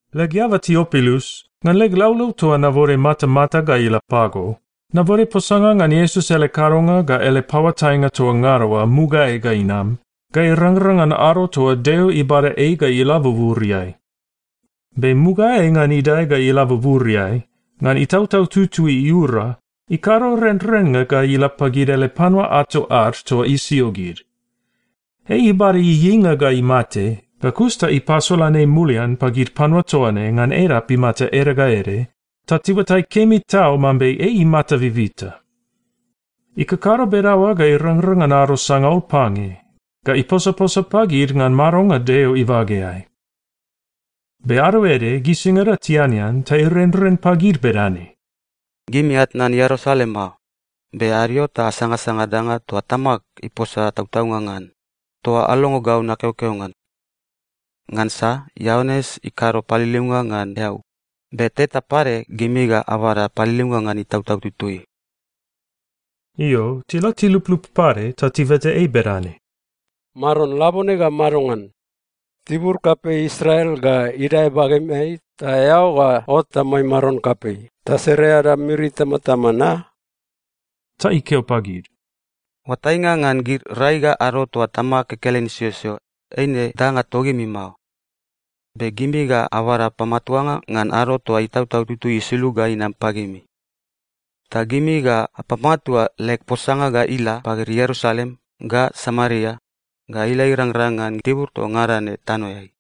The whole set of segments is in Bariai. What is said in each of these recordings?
Leg eaba Tiopilus, ngan leg laulau toa nabode matamata ga ila pago, nabode posanga ngan Iesus ele kadonga ga ele paoatainga toa ngada oa mugaeai ga inam ga irangrang ngan ado toa Deo ibada ei ga ila buburiai. Be mugaeai ngan idae ga ila buburiai, ngan Itautau Tutui iura, ikado renrennga ga ila pagid ele panua ato ad toa isio gid. Ei ibada ieieinga ga imate, ga kus ta ipasolan ei mulian pagid panua toa ne ngan edap imata ede ga ede, ta tiuatai kemi tau mambe ei imata bibita. Ikakado bedaoa ga irangrang ngan ado sangaul pange, ga iposaposa pagid ngan madonga Deo ibageai. Be ado ede, gisingada tianean, ta irenren pagid bedane, “Gimi atnan Ierusalem mao, be adio ta asangasanga danga toa Tamag iposa tautaunga ngan, toa alongo gau nakeokeo ngan. Ngansa Ioanes ikado paliliunga ngan eau, be teta pade gimi ga abada paliliunga ngan Itautau Tutui.” Io, tila tiluplup pade, ta tibeta ei bedane, “Maron, labone gau madongan? Tibur kapei Israel ga idae bagemeai ta eao ga ot amai maron kapei ta sere ada miri itamatama na?” Ta ikeo pagid, “Oatainga ngan gid rai ga ado toa Tamag kekelen isiosio, eine danga togimi mao. Be gimi ga abada pamatuanga ngan ado toa Itautau Tutui isulug ga inam pagimi. Ta gimi ga apamatua leg posanga ga ila pagid Ierusalem, ga Samaria, ga ila irangrang ngan tibur toa ngada ne tanoeai.”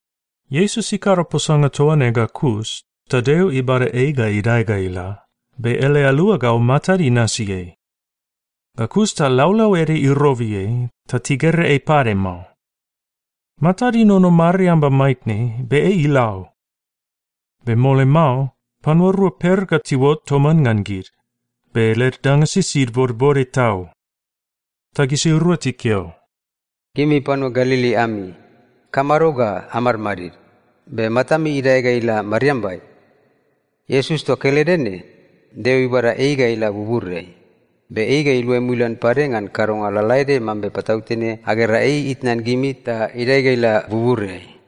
Iesus ikado posanga toa ne ga kus, ta Deo ibada ei ga idae ga ila, be ele aluagau matad inasi ei. Ga kus ta laulau ede irobi ei, ta tigera ei pade mao. Matad inono mariamba maitne, be ei ila o. Be mole mao, panua rua per ga tiuot toman ngan gid, be led danga sisid bodbode tau. Ta gisirua tikeo, “Gimi panua Galili ami, ikamado ga amadmadid, be matami idae ga ila mariambai? Iesus toa kelede ne, Deo ibada ei ga ila buburiai, be ei ga iluai mulian pade ngan kadonga lalaede mambe patautene agera ei itnan gimi ta idae ga ila buburiai.”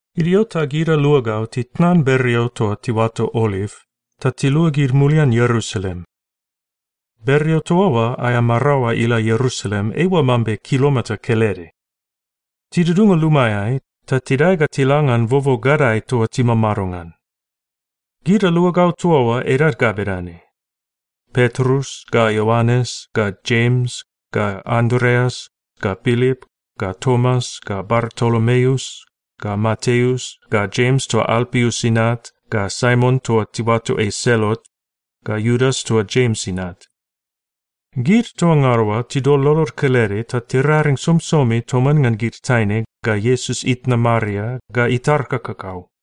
Idio ta gid aluagau titnan bereo toa tiuato Oliv, ta tiluagid mulian Ierusalem. (Bereo toa oa aea maraoa ila Ierusalem eiua mambe kilomita kelede.) Tidudunga lumaeai, ta tidae ga tila ngan bobo gadae toa timamado ngan. Gid aluagau toa oa edad ga bedane: Petrus, ga Ioanes, ga Jems, ga Andreas, ga Pilip, ga Tomas, ga Bartolomeus, ga Mateus, ga Jems toa Alpius inat, ga Saimon toa tiuato ei Selot, ga Iudas toa Jems inat. Gid toa ngada oa tidol lolod kelede ta tiraring somisomi toman ngan gid taine, ga Iesus itna Maria, ga itar kakakau.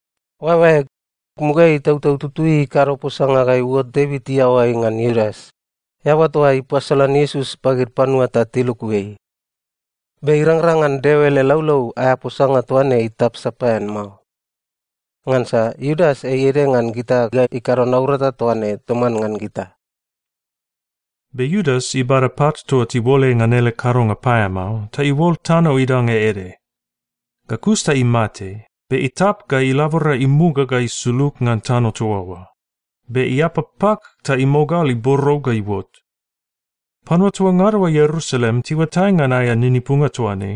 “Oaeoaeg, mugaeai Itautau Tutui ikado posanga ga iuot Devit iaoai ngan Iudas, eaba toa ipasolan Iesus pagid panua ta tiluku ei. Be irangrang ngan Deo ele laulau aea posanga toa ne itap sapaean mao. Ngansa Iudas ei ede ngan gita ga ikado naurata toa ne toman ngan gita.” (Be Iudas ibada pat toa tiuol ei ngan ele kadonga paeamao, ta iuol tano idanga ede. Ga kus ta imate, be itap ga ilabora imuga ga isulug ngan tano toa oa, be iapa pak ta imogal iborou ga iuot. Panua toa ngada oa Ierusalem tiuatai ngan aea ninipunga toa ne,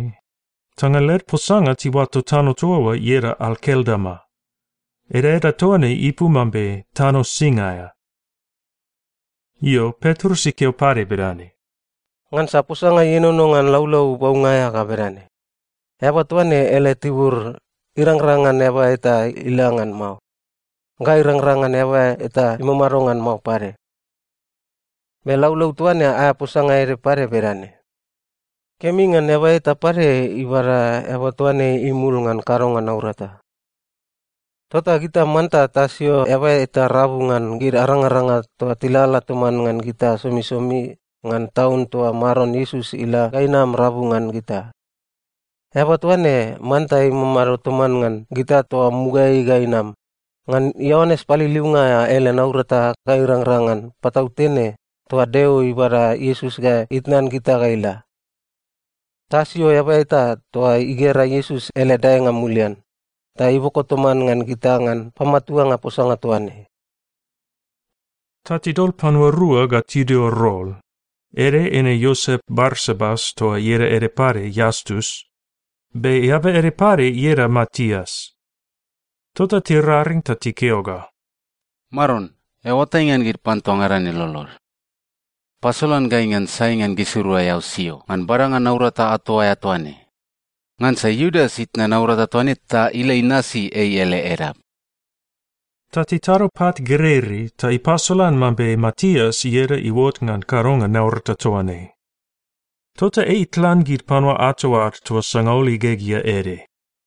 ta ngan led posanga tiuato tano toa oa ieda Akeldama. Edaeda toa ne ipu mambe Tano Sing aea.) Io, Petrus ikeo pade bedane, “Ngansa posanga ienono ngan Laulau Baunga aea ga bedane, “‘Eaba toa ne ele tibur, irangrang ngan eaba eta ila ngan mao. Ga irangrang ngan eaba eta imamado ngan mao pade.’ Be laulau toa ne aea posanga ede pade bedane, “‘Kemi ngan eaba eta pade ibada eaba toa ne imul ngan kadonga naurata.’ Tota gita manta tasio eaba eta rabu ngan gid arangaranga toa tilalala toman ngan gita somisomi ngan taun toa Maron Iesus ila ga inam rabu ngan gita. Eaba toa ne manta imamado toman ngan gita toa mugaeai ga inam, ngan Ioanes Paliliunga aea ele naurata ga irangrang ngan patautene toa Deo ibada Iesus ga itnan gita ga ila. Tasio eaba eta toa igera Iesus ele daenga mulian, ta iboko toman ngan gita ngan pamatuanga posanga toa ne.” Ta tidol panua rua ga tidio rol, ede eine Iosep Barsabas toa ieda ede pade Iastus, be eaba ede pade ieda Matias. Tota tiraring ta tikeo ga, “Maron, eao oatai ngan panua toa ngada ne lolod. Pasolan gai ngan sai ngan gisirua eao sio ngan badanga naurata ato aea toa ne. Ngansa Iudas itnan naurata toa ne ta ila inasi ei ele edap.” Ta titado pat gereirei ta ipasolan mambe Matias ieda iuot ngan kadonga naurata toa ne. Tota ei itlan gid panua ato ad toa sangaul igegea ede.